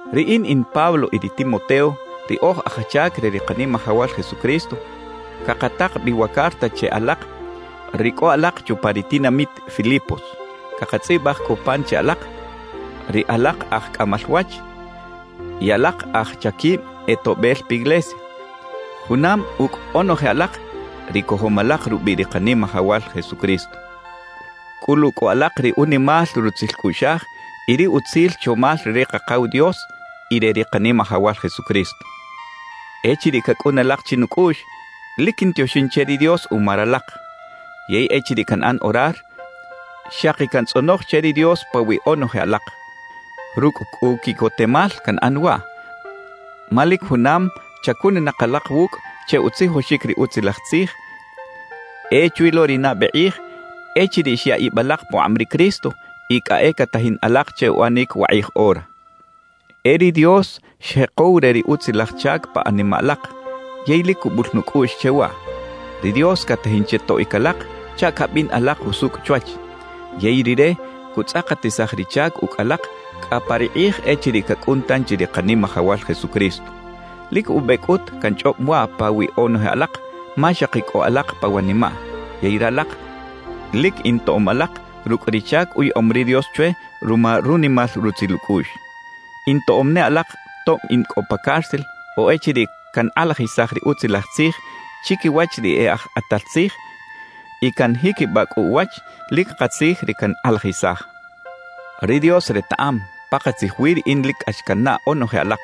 Riꞌin in Pablo y ri Timoteo, ri oj aj chac re ri Kanimajawal Jesucristo, cakatak bi wa carta che alak ri cꞌo alak chupa ri tinamit Filipos. Cakatzꞌibaj cꞌu pan che alak, ri alak aj cꞌamal wach y alak aj chaquib e toꞌbel piglesia, junam ucꞌ onoje alak, ri cojom alak rubiꞌ ri Kanimajawal Jesucristo. Cꞌulu cꞌu alak ri unimal rutzil cꞌuꞌxaj y ri utzil chomal re ri Kakaw Dios y re ri Kanimajawal Jesucristo. Echiriꞌ cacꞌun alak chinucꞌuꞌx, lic quintioxin che ri Dios uma ralak. Yey echiriꞌ canꞌan orar, xaki cantzꞌonoj che ri Dios pawiꞌ onoje alak. Rucꞌ cꞌu quiꞌcotemal canꞌan waꞌ, ma lic junam chacuninak alak wucꞌ che utzijoxic ri Utzilaj Tzij e chwi lo ri nabe kꞌij echiriꞌ xya ib alak pukꞌab ri Cristo y cꞌa e catajin alak che uꞌanic wakꞌij ora. E ri Dios xjekow re ri utzilaj chac pa animaꞌ alak, yey lic cubul nucꞌuꞌx che waꞌ: Ri Dios catajin che toꞌic alak chaꞌ cabin alak jusucꞌ chwach, yey Rire cutzꞌakatisaj ri chac ucꞌ alak cꞌa pa ri kꞌij echiriꞌ cacꞌun tanchi ri Kanimajawal Jesucristo. Lic ube cꞌut canchꞌob waꞌ pawiꞌ onoje alak, ma xaki cꞌo alak pa wanimaꞌ. Yey ralak lic intoꞌom alak rucꞌ ri chac uyaꞌom ri Dios chwe ruma runimal rutzil ucꞌuꞌx. Intoꞌom ne alak tob in cꞌo pa cárcel o echiriꞌ cankꞌalajisaj ri Utzilaj Tzij chiquiwach ri e aj kꞌatal tzij y canjiquibaꞌ cꞌu uwach lic katzij ri cankꞌalajisaj. Ri Dios retaꞌam, pakatzij wi riꞌin lic cꞌax cannaꞌ onoje alak.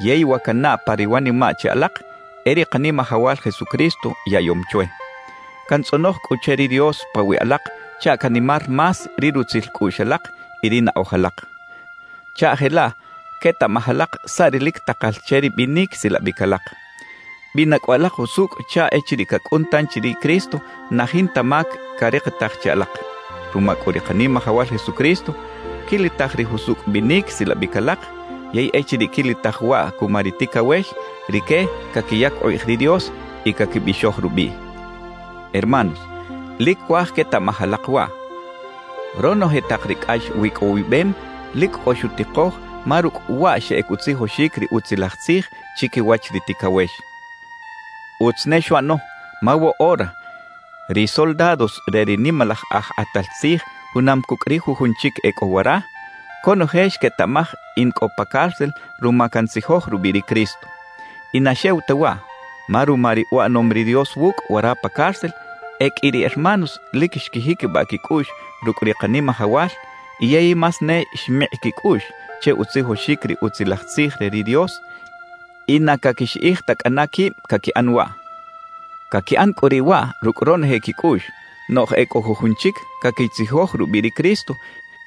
Yey wa cannaꞌ pa ri wanimaꞌ che alak, e ri Kanimajawal Jesucristo yaꞌyom chwe. Cantzꞌonoj cꞌu che ri Dios pawiꞌ alak chaꞌ canimar más ri rutzil cꞌuꞌx alak y ri naꞌoj alak chaꞌ jelaꞌ quetaꞌmaj alak saꞌ ri lic takal che ri binic silabic alak. Bina cꞌu alak jusucꞌ chaꞌ echiriꞌ cacꞌun tanchi ri Cristo na jinta mac carikitaj che alak. Ruma cꞌu ri Kanimajawal Jesucristo quilitaj ri jusucꞌ binic silabic alak, yey echiriꞌ quilitaj waꞌ cuma ri ticawex, rique caquiyac ukꞌij ri Dios y caquibixoj rubiꞌ. Hermanos, lic cuaj quetaꞌmaj alak waꞌ: Ronoje tak ri cꞌax wicꞌowibem lic cꞌo xutikoj ma rucꞌ waꞌ xeꞌec utzijoxic ri Utzilaj Tzij chiquiwach ri ticawex. Utz ne xuꞌano, ma woꞌora ri soldados re ri nimalaj aj kꞌatal tzij junam cucꞌ ri jujun chic e cꞌo wara, conoje xquetaꞌmaj in cꞌo pa cárcel ruma cantzijoj rubiꞌ ri Cristo. Y na xew ta waꞌ, ma ruma ri uꞌanom ri Dios wucꞌ wara pa cárcel, e qꞌui ri hermanos lic xquijiquibaꞌ quicꞌuꞌx rucꞌ ri Kanimajawal yey más ne xmikꞌ quicꞌuꞌx che utzijoxic ri Utzilaj Tzij re ri Dios y na caquixiꞌij ta cꞌana quib caquiꞌan waꞌ. Caquiꞌan cꞌu riꞌ waꞌ rucꞌ ronoje quicꞌuꞌx, noꞌj e cꞌo jujun chic caquitzijoj rubiꞌ ri Cristo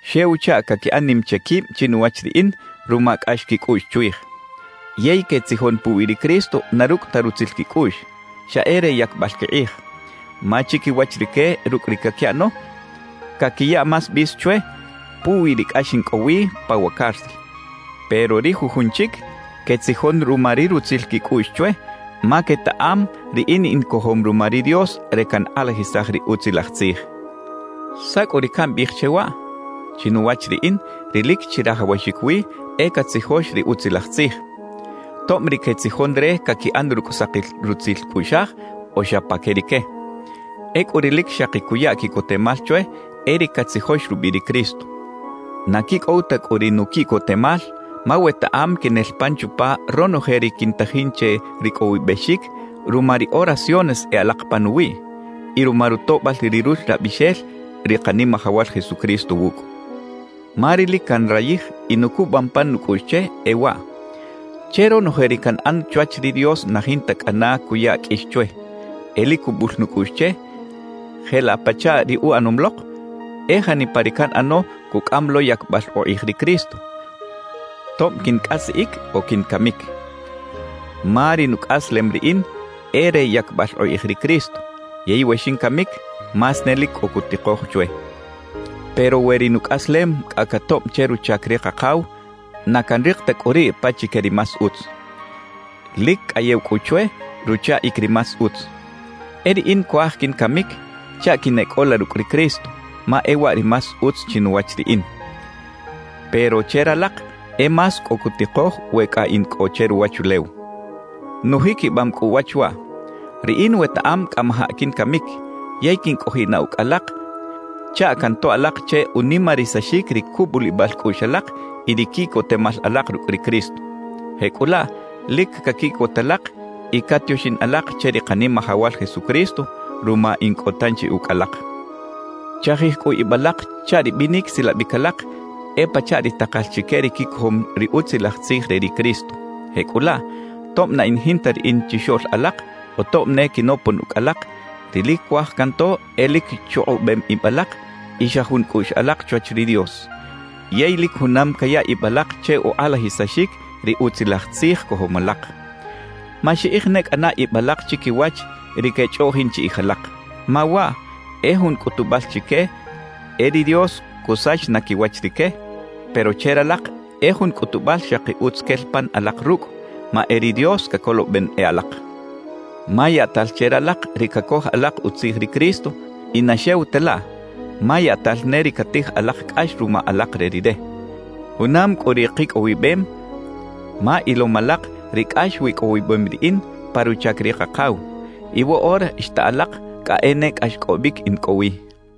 xew chaꞌ caquiꞌan nim che quib chinuwach riꞌin ruma cꞌax quicꞌuꞌx chwij. Yey quetzijon puwi ri Cristo na rucꞌ ta rutzil quicꞌuꞌx, xa e re yacbal quikꞌij. Ma chiquiwach rique rucꞌ ri caquiꞌano, caquiya más bis chwe puwi ri cꞌax in cꞌo wi pa wa cárcel. Pero ri jujun chic quetzijon ruma ri rutzil quicꞌuꞌx chwe, ma quetaꞌam riꞌin in cojom ruma ri Dios re cankꞌalajisaj ri Utzilaj Tzij. ¿Saꞌ cꞌu ri cambiꞌij che waꞌ? Chinuwach riꞌin, ri lic chirajawaxic wi e catzijox ri Utzilaj Tzij, tob ri quetzijon re caquiꞌan rucꞌ sakil rutzil cꞌuꞌxaj o xa pa que rique. Ecꞌu ri lic xaki cuya quiꞌcotemal chwe e ri catzijox rubiꞌ ri Cristo. Na quicꞌow ta cꞌu ri nuquiꞌcotemal, ma wetaꞌam quinel pan chupa ronoje ri quintajin che ricꞌowibexic ruma ri oraciones e alak panuwiꞌ y ruma rutoꞌbal ri Ruxlabixel ri Kanimajawal Jesucristo wucꞌ. Ma ri lic canrayij y nucubam pan nucꞌuꞌx che, e waꞌ: Che ronoje ri canꞌan chwach ri Dios na jinta cꞌana cuya qꞌuix chwe. E lic cubul nucꞌuꞌx che, jelaꞌ pachaꞌ ri uꞌanom lok, e janipa ri canꞌano cucꞌam lo yacbal ukꞌij ri Cristo, tob quincꞌasiꞌic o quincamic. Ma ri nucꞌaslem riꞌin e re yacbal ukꞌij ri Cristo; yey we xincamic, más ne lic cꞌo cutikoj chwe. Pero we ri nucꞌaslem cꞌa catoꞌb che ruchac ri Kakaw, na canrik ta cꞌu riꞌ pachique ri más utz. Lic cꞌayew cꞌu chwe ruchaꞌic ri más utz. E riꞌin cuaj quincamic chaꞌ quineꞌcꞌola rucꞌ ri Cristo, ma e waꞌ ri más utz chinuwach riꞌin. Pero che ralak e más cꞌo cutikoj we cꞌa in cꞌo che ruwachulew. Nujiquibam cꞌu uwach waꞌ, riꞌin wetaꞌam cꞌamajaꞌ quincamic yey quincꞌojiꞌ na ucꞌ alak chaꞌ cantoꞌ alak che unimarisaxic ri cubulibal cꞌuꞌx alak y ri quiꞌcotemal alak rucꞌ ri Cristo. Jecꞌulaꞌ lic caquiꞌcot alak y catioxin alak che ri Kanimajawal Jesucristo ruma in cꞌo tanchi ucꞌ alak. Chajij cꞌu ib alak chaꞌ ri binic silabic alak e pachaꞌ ri takal chique ri quicojom ri Utzilaj Tzij re ri Cristo. Jecꞌulaꞌ, tob na in jinta riꞌin chixoꞌl alak o tob ne quinopon ucꞌ alak, ri lic cuaj canto e lic chukꞌubem ib alak y xa jun cꞌuꞌx alak chwach ri Dios, yey lic junam caya ib alak che ukꞌalajisaxic ri Utzilaj Tzij cojom alak. Maxiꞌij ne cꞌana ib alak chiquiwach ri quechꞌoꞌjin chiꞌij alak, ma waꞌ e jun cꞌutubal chique e ri Dios cusach na quiwach rique; pero che ralak e jun cꞌutubal xaki utz quel pan alak rucꞌ, ma e ri Dios cacoloben e alak. Ma yaꞌtal che ralak ri cacoj alak utzij ri Cristo, y na xew ta laꞌ, ma yaꞌtal ne ri catij alak cꞌax ruma alak re Rire. Junam cꞌu ri kicꞌowibem, ma ilom alak ri cꞌax wicꞌowibem riꞌin pa ruchac ri Kakaw, y woꞌora xta alak cꞌa e ne cꞌaxcꞌobic in cꞌo wi.